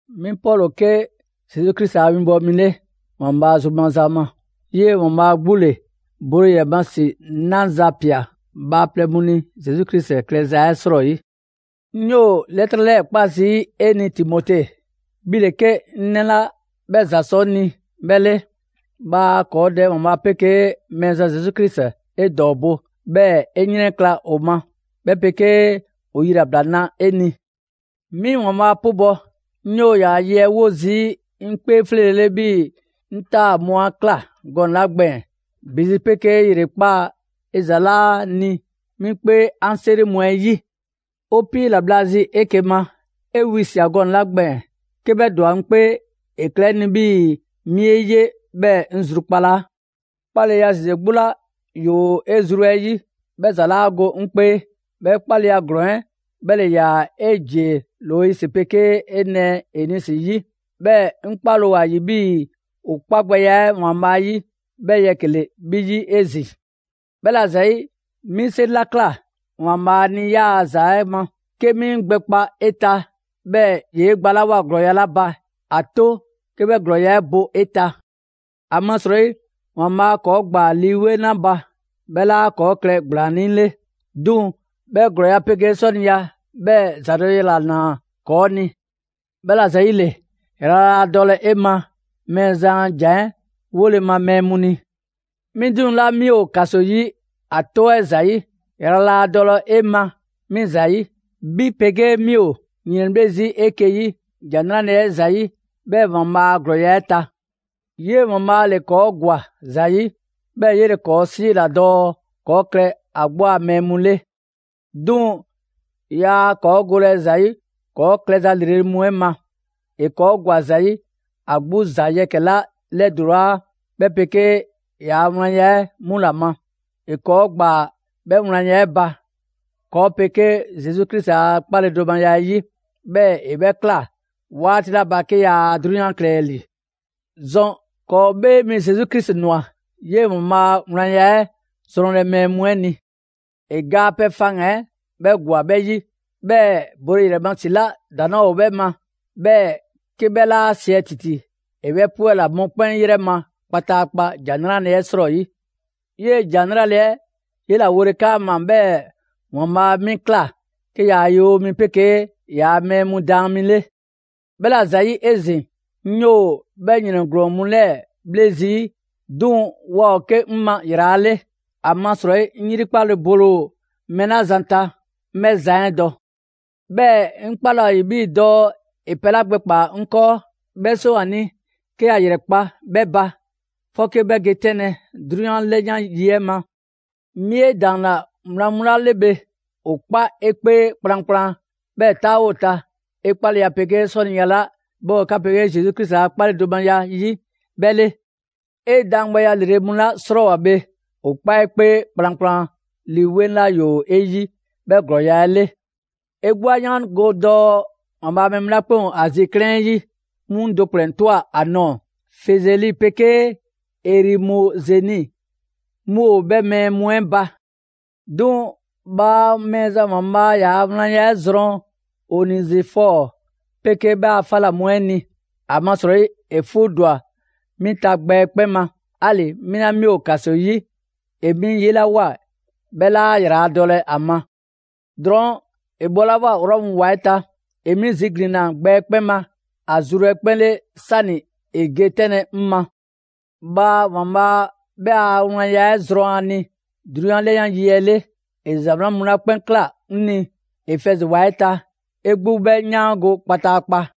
'Mi Pɔlu ‑o 'ke Zesu Krisi a 'winbɔwo mi 'le, ‑Waanbhaa' zru maza ma; 'yee‑ ‑Waanbhaa' 'gbu ‑le bole ‑yrɛ ma ‑si 'naza‑ ꞊pia bhaaplɛŋ mu ni Zesu Krisi klɛza 'ɛ 'srɔyi. 'Ŋ 'yoo‑ 'lɛtrɛ 'lɛɛ‑ 'kpa zii' 'e ni Timote, 'bhi ‑le 'ke 'ŋ 'nɛ 'la 'bhɛ ‑za sɔ 'ŋ ni 'bhɛ 'le. Bhaa ‑kɔɔ' Dɛ ‑Waanbhaa' 'pegee Mɛɛzan Zesu Krisi 'e ‑dɔɔbo', 'bhɛɛ‑ 'e 'yrɛnkla‑ ‑o ma, 'bhɛ 'pegee ‑o yilabla 'na 'e ni! 'Mi ‑Waanbhaa' 'pubɔ‑; 'ŋ 'yoo‑ ‑yaa' ye 'ɛ 'wo zii' 'ŋ 'kpee 'fleele‑ 'le 'bhii‑ 'ŋ 'taa‑ mu 'a ꞊kla gɔnɛ‑ 'la gbɛɛn‑. ‑Bi zi 'pegee ‑yrekpaa' 'e ‑za 'laa ni 'ŋ 'kpee 'an 'seri mu 'ɛ 'yi. 'O 'piila‑ bhla zi 'eke‑ ma, 'e wisia꞊ gɔnɛ‑ 'la gbɛɛn‑, 'ke 'bhɛ ‑dwa 'ŋ 'kpee, ‑e klɛ 'ŋ ni 'bhii‑ 'mi 'e 'ye 'bhɛɛ‑ 'ŋ zrukpalaa. 'Kpaleya ‑zeze 'gbu 'la ‑yoo 'e zru 'ɛ 'yi, 'bhɛ ‑za 'laa go 'ŋ 'kpee. 'Bhɛ 'kpaleya ‑glɔɔn 'ɛ 'bhɛ ‑le ‑yaa 'e ‑jie Loisi 'pegee 'e nɛɛ Enisi 'yi; 'bhɛɛ‑ 'ŋ 'kpale‑ ‑o ‑a ‑yi 'bhii‑ ‑o 'kpa gbɛya 'ɛ ‑Waanbhaa' 'yi 'bhɛɛ‑ yɛkɛ‑ ‑le 'bhi 'yi 'ezin‑. 'Bhɛla‑ ‑zayi', 'mi 'seri 'la ꞊kla ‑Waanbhaa' ni 'yaa‑ ‑za ma 'ke 'mi 'ŋ gbɛkpa 'e ta, 'bhɛɛ‑ ‑yee' gbalawoa ‑glɔɔya' 'la ba, ‑a 'to 'ke 'bhɛ ‑glɔɔya' 'ɛ bo 'e ta. ‑Amasrɔyi ‑Waanbhaa' ‑kɔɔ' ‑gbaa Lii 'Weŋ 'la ba, 'bhɛ 'laa ‑kɔɔ' klɛ ‑gblaannii' 'le, 'duŋ‑ 'bhɛ ‑glɔɔya' 'pegee 'sɔniya, 'bhɛɛ‑ ‑zadɔleya ‑la ‑naa ‑kɔɔ' ni. 'Bhɛla‑ ‑zayile, ‑yrala' laa dɔlɛ 'e ma Mɛɛzan a ‑jan 'ɛ 'wole‑ ma mɛɛ mu ni. 'Mi 'duŋ‑ 'la 'mi ‑o ‑kaso 'yi ‑a 'tɔ 'ɛ ‑zayi', ‑yrala' laa dɔlɛ 'e ma 'mi ‑zayi'. 'Bhi 'pegee 'mi 'o ‑yrɛnbhle' 'eke‑ 'yi ‑Jan 'Nrale‑ 'ɛ ‑zayi', 'bhɛɛ‑ ‑Waanbhaa' ‑glɔɔya' 'ɛ ta. 'Yee‑ ‑Waanbhaa' ‑le ‑kɔɔ' ‑gwa ‑za 'yi, 'bhɛɛ‑ 'yele‑ ‑kɔɔ' 'siila‑ dɔɔ ‑kɔɔ' klɛ ‑a 'gbu a mɛɛ mu 'le. 'Duŋ‑ 'yaa ‑kɔɔ' golɛ ‑za 'yi ‑kɔɔ' klɛ za ‑lrele' mu 'ɛ ma, ‑e ‑kɔɔ' ‑gwa ‑za 'yi ‑a 'gbu ‑za yɛkɛ‑ 'la 'lɛdulaa, 'bhɛ 'pegee ‑yaa' wlanya 'ɛ 'mu ‑la ma. ‑E ‑kɔɔ' ‑gbaa 'bhɛ wlanya 'ɛ ba, ‑kɔɔ' 'pegee Zesu Krisi a 'kpaledomaya 'ɛ 'yi, 'bhɛɛ‑ ‑e 'bhɛ ꞊kla 'waati 'la ba 'ke yaa 'drunyan klɛlɛ ‑li. ‑Zɔn ‑kɔɔ' 'Bhee Mi Zesu Krisi ꞊nwa 'yee‑ ‑Waanbhaa' a wlanya 'ɛ zrɔnlɛ mɛɛ mu 'ɛ ni. ‑E ga a pɛ faŋgan‑ 'ɛ 'bhɛ ‑gwa 'bhɛ 'yi, 'bhɛɛ‑ bole ‑yrɛ ma ‑si 'la ‑daŋ' 'laa ‑o 'bhɛ ma, 'bhɛɛ‑ 'ke 'bhɛ 'laa siɛ ‑titi, ‑e 'bhɛ 'pwɛla‑ mɔkpɛn' 'yrɛ ma kpataakpa ‑Jan 'Nrale‑ 'ɛ 'srɔyi. 'Yee‑ ‑Jan 'nrale‑ 'ɛ 'yela‑ wole 'kaama‑, 'bhɛɛ‑ ‑Waanbhaa' 'mi ꞊kla 'ke ‑yaa' winbɔwo 'pegee ‑yaa' mɛɛ mu daan mi 'le. 'Bhɛla‑ ‑zayi' 'ezin‑, 'ŋ 'yoo‑ 'bhɛ ‑yrɛn ‑glɔɔn mu 'lɛɛ‑ 'bhle zii'; 'duŋ‑ waa ‑o 'ke 'ŋ ma ‑yrala' 'le. ‑Amasrɔyi 'ŋ 'yrikpale bole ‑o mɛɛ 'la zan ta, 'ŋ 'bhɛ zan 'ɛ dɔ; 'bhɛɛ‑ 'ŋ 'kpale ‑o ‑a ‑yi 'bhii‑ dɔɔ ‑e pɛ 'la gbɛkpaa‑ 'ŋ 'kɔɔ, 'bhɛ 'seŋ ‑o ‑a ni 'ke ‑ya ‑yrɛkpa' 'bhɛ ba, 'fɔke 'bhɛ ge 'tɛnlɛ‑ 'drunyan 'lɛyan 'yi 'ɛ ma. 'Mi 'e ‑daanna wlan ma ‑jan mu 'la 'le bhe, ‑o 'kpa 'e 'kpee kplankplan, 'bhɛɛ‑ 'taawo ‑o ta 'e 'kpaleya 'pegee 'sɔniya 'la 'bhɛ ‑o 'ka 'pegee Zesu Krisi a 'kpaledomaya 'yi 'bhɛ 'le. 'E daangbɛya 'lrele‑ mu 'la 'srɔɔwoa‑ bhe, ‑o 'kpa 'e 'kpee kplankplan Lii 'Weŋ 'la ‑yoo 'e 'yi, 'bhɛ ‑glɔɔya' 'ɛ 'le. 'E 'gbu 'a 'yaango‑ dɔɔ ‑Waanbhaa' a mɛɛ mu 'la 'kpɛn ‑o Azi 'klɛɛn 'ɛ 'yi, 'mu 'ŋ do ‑kplɛn ꞊twa ‑a nɔɔ‑; Fizɛli 'pegee Erimozɛni mu ‑o 'bhɛ mɛɛ mu 'ɛ ba. 'Duŋ‑ bhaa Mɛɛzan ‑Waanbhaa' ‑yaa' wlanya 'ɛ zrɔn Onezifɔɔ 'pegee 'bhɛ a 'fa ‑la mu 'ɛ ni. ‑Amasrɔyi ‑e 'fuu ‑dwa 'mi ta gbɛ 'ɛ 'kpɛn ma; 'ali‑ 'mi 'la 'mi ‑o ‑kaso 'yi, ‑e 'mi 'yelawoa, 'bhɛ 'laa ‑yraladɔlɛ ‑a ma. Drɔɔn', ‑e bhɔlawoa Rɔmu ‑wa 'ɛ ta, ‑e 'mi ziglinna gbɛ 'ɛ 'kpɛn ma ‑a zru 'ɛ 'kpɛn 'le 'sani‑ ‑e ge 'tɛnlɛ‑ 'ŋ ma. Bhaa ‑Waanbhaa' 'bhɛ a wlanya 'ɛ zrɔn ‑a ni 'drunyan 'lɛyan 'yi 'le. ‑E ‑za 'wlan mu 'la 'kpɛn ꞊kla 'ŋ ni Efɛzi ‑wa 'ɛ ta, 'e 'gbu 'bhɛ 'yaango‑ kpataakpa.